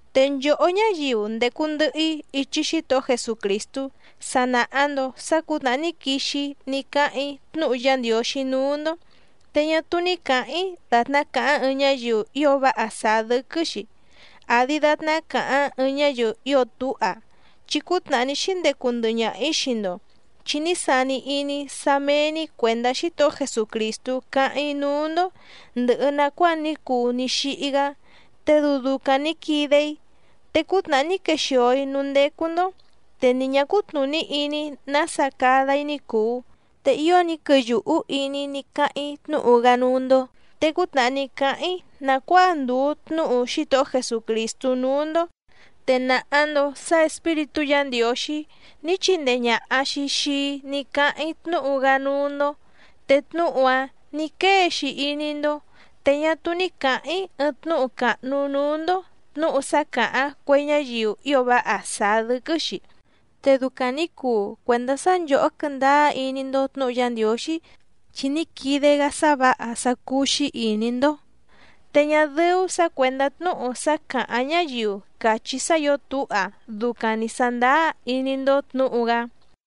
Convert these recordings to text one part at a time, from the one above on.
Te nchòhó ñáyiu ndècu ndɨhɨ‑í ichi Xítohó Jesucrìstú sa nàha‑ndo sá cǔtnàhá ní quixi‑í ní cáháⁿ‑í tnúhu Yá Ndiǒxí núú‑ndó, te ñá túú ní cǎháⁿ‑í dàtná càháⁿ ɨɨⁿ ñáyiu ío váha sàá dɨ́quɨ́‑xi, àdi datná càháⁿ ɨɨⁿ ñáyiu ío túha. Chi cútnàhá ní xíndecu ndɨhɨ ñaha‑ǐ xii‑ndo chi ní sani iní‑í sá méé‑ní cuèndá Xítohó Jesucrìstú cáháⁿ‑í núú‑ndó ndɨ̀hɨ nacuáa ní cuu ní xíhí‑gá, te dɨu ducaⁿ nǐ quide‑í. Te cútnàhá ní quexìo‑í núú ndécú‑ndó te ni ñǎ cútnùní iní‑í nása cada‑í ní cùu, te ío ní quɨyùhú iní‑í ní cáháⁿ‑í tnúhu‑gá núú‑ndó. Te cútnàhá ní cáháⁿ‑í nàcuáa ndùu tnúhu Xítohó Jesucrìstú núú‑ndó, te nàha‑ndo sá Espíritú Yǎ Ndiǒxí ní chindee ñàha‑xi xii‑í ní cáháⁿ‑í tnúhu‑gá núú‑ndó, te tnúhu‑áⁿ nǐ quée‑xi iní‑ndó. Te ñá túú ní cǎháⁿ‑í ɨɨⁿ tnúhu càhnu núú‑ndó tnǔhu sá càháⁿ cue ñáyiu ío váha sàá dɨ́quɨ́‑xi. Te ducaⁿ nǐ cuu cuèndá sá nchòhó quɨ́ndáá iní‑ndó tnǔhu Yá Ndiǒxí chi ní quide‑gá sá vǎha sá cúú‑xí ìní‑ndó, te ñá dɨ́ú sǎ cuèndá tnúhu sá càháⁿ ñáyiu càchí sá ǐo túha ducaⁿ nǐ sándáá iní‑ndó tnǔhu‑gá.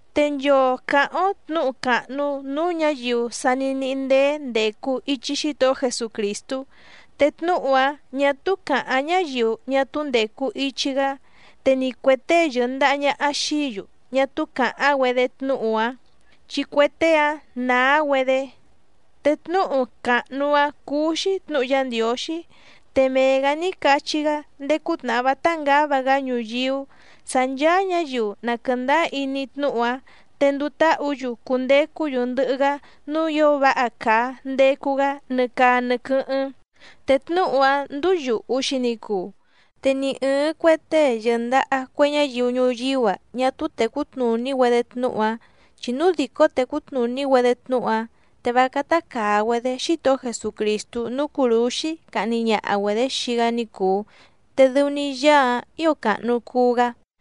Te nchoo càháⁿ‑ó tnǔhu càhnu núú ñǎyiu sa ní níhí ndéé ndècu ichi Xítohó Jesucrìstú. Te tnúhu‑áⁿ ñà túú càháⁿ ñáyiu ñá túú ndècu ichi‑gá, te ni cuè tée yɨ̀ndaha ñaha xií‑yu ñá túú càháⁿ‑güedé tnúhu‑áⁿ chi cue tée‑áⁿ naa‑güedé. Te tnúhu càhnu‑áⁿ cúú‑xí tnǔhu Yá Ndiǒxí, te mee‑gǎ ní cachí‑gá ndéé cútnàhá vátá ngǎva‑gá ñuyíú sǎ ncháá ñǎyiu na quɨ̀ndáá iní tnúhu‑áⁿ te nduu táhǔ‑yu cundecú‑yu ndɨhɨ‑gá núú ǐo váha càa ndecu‑gá nɨ caa nɨ quɨ́hɨ́ⁿ. Te tnúhu‑áⁿ ndúú yùhu‑xi ni cuu. Te ni ɨ̀ɨⁿ cue tée yɨ̀ndaha cue ñáyiu ñuyíú‑a ñá túú tècú tnùní‑güedé tnúhu‑áⁿ, chi núu dìcó tècú tnùní‑güedé tnúhu‑áⁿ te vá cátá càa‑güedé Xítohó Jesucrìstú núú cùrúxí cahni ñaha‑güedě xii‑gá ní cùu. Te dɨu‑ni Yaá‑áⁿ ǐo càhnu cuu‑gá.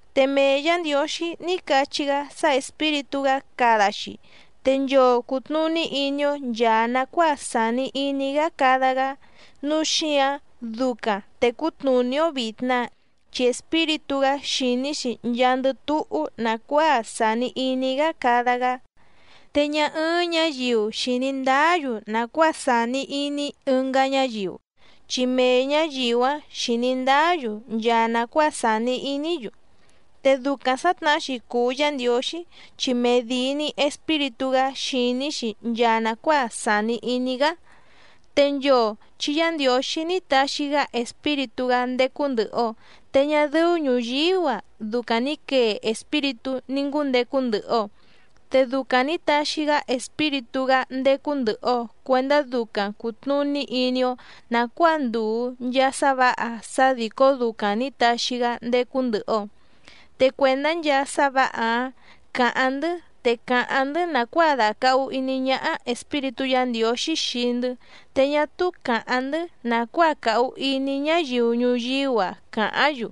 Te mee Yǎ Ndiǒxí ní cachí‑gá sá Espíritú‑gá cada‑xi te nchoo cùtnuní iní‑ó nchàa nacuáa sàni iní‑gá cada‑gá, nǔu xíǎⁿ ducaⁿ tècú tnùní‑ó vìtna, chi Espíritú‑gá xìní‑xi nchaandɨ túhú nàcuáa sàni iní‑gá cada‑gá. Te ñá ɨ́ɨ́ⁿ ñǎyiu xìní ndáá‑yu nàcuáa sàni iní ɨngá ñáyiu, chi mee ñǎyiu‑áⁿ xìní ndáá‑yu nchaa nàcuáa sàni iní‑yu. Te ducaⁿ sǎtnahá‑xi cùu Yá Ndiǒxí chi medìi‑ni Espíritú‑gá xìní‑xi nchaa nàcuáa sàni iní‑gá. Te nchoo chi Yá Ndiǒxí ní taxi‑gá Espíritú‑gá ndécú ndɨ̀hɨ‑o, te ñá dɨ́ú ñùyíú‑a ducaⁿ ni quèe espíritú ní ngúndecu ndɨhɨ‑o. Te ducaⁿ nǐ taxi‑gá Espíritú‑gá ndécú ndɨ̀hɨ‑o cuendá ducaⁿ cùtnuní iní‑ó nàcuáa ndùu nchaa sá vǎha sá dìcó ducaⁿ nǐ taxi‑gá ndécú ndɨ̀hɨ‑o. Te cuèndá nchaa sá vǎha‑áⁿ càháⁿ‑ndɨ́, te càháⁿ‑ndɨ́ nàcuáa dàcahu iní ñáhá Espíritú Yǎ Ndiǒxí xii‑ndɨ́, te ñá túú càháⁿ‑ndɨ́ nàcuáa càhu iní ñáyiu ñuyíú‑a càháⁿ‑yu,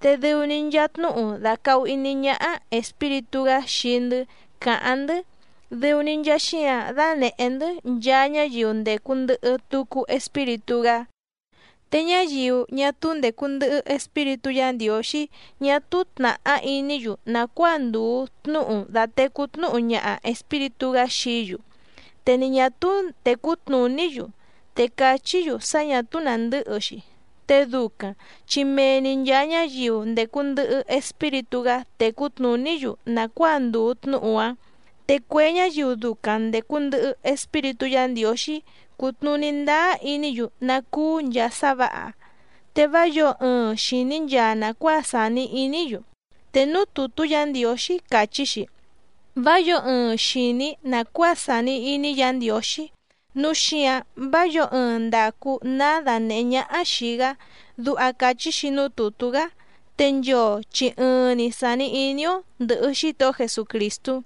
te dɨu‑ni nchaa tnúhu dàcahu iní ñáhá Espíritú‑gá xii‑ndɨ́ càháⁿ‑ndɨ́, dɨu‑ni nchaa xíǎⁿ dánèhé‑ndɨ́ nchaa ñáyiu ndècu ndɨhɨ tucu Espíritú‑gá. Te ñáyiu ñá túú ndècu ndɨhɨ Espíritú Yǎ Ndiǒxí ñá túú tnàhá iní‑yu nàcuáa ndùu tnúhu dàtecú tnúhu ñaha Espíritú‑gá xií‑yu, te ni ñà túú tècú tnùní‑yu, te càchí‑yu sá ñà túú nàndɨ́hɨ‑xi. Te ducaⁿ chi mee‑ni nchàa ñáyiu ndècu ndɨhɨ Espíritú‑gá tècú tnùní‑yu nàcuáa ndùu tnúhu‑áⁿ. Te cue ñáyiu ducaⁿ ndècu ndɨhɨ Espíritú Yǎ Ndiǒxí cútnùní ndáá iní‑yu ná cúú nchàa sá vǎha, te vá yǒo ɨɨⁿ xìní nchaa nàcuáa sàni iní‑yu. Te núú tùtú Yǎ Ndiǒxí càchí‑xi: “Vá yǒo ɨɨⁿ xìní nàcuáa sàni iní Yǎ Ndiǒxí, núu xíǎⁿ vá yǒo ɨɨⁿ ndacu ná danèhé ñáhá xìi‑gá”, duha càchí‑xi núú tùtú‑gá. Te nchoo chi ɨɨⁿ‑ni sàni iní‑ó ndɨ̀hɨ Xítohó Jesucrìstú.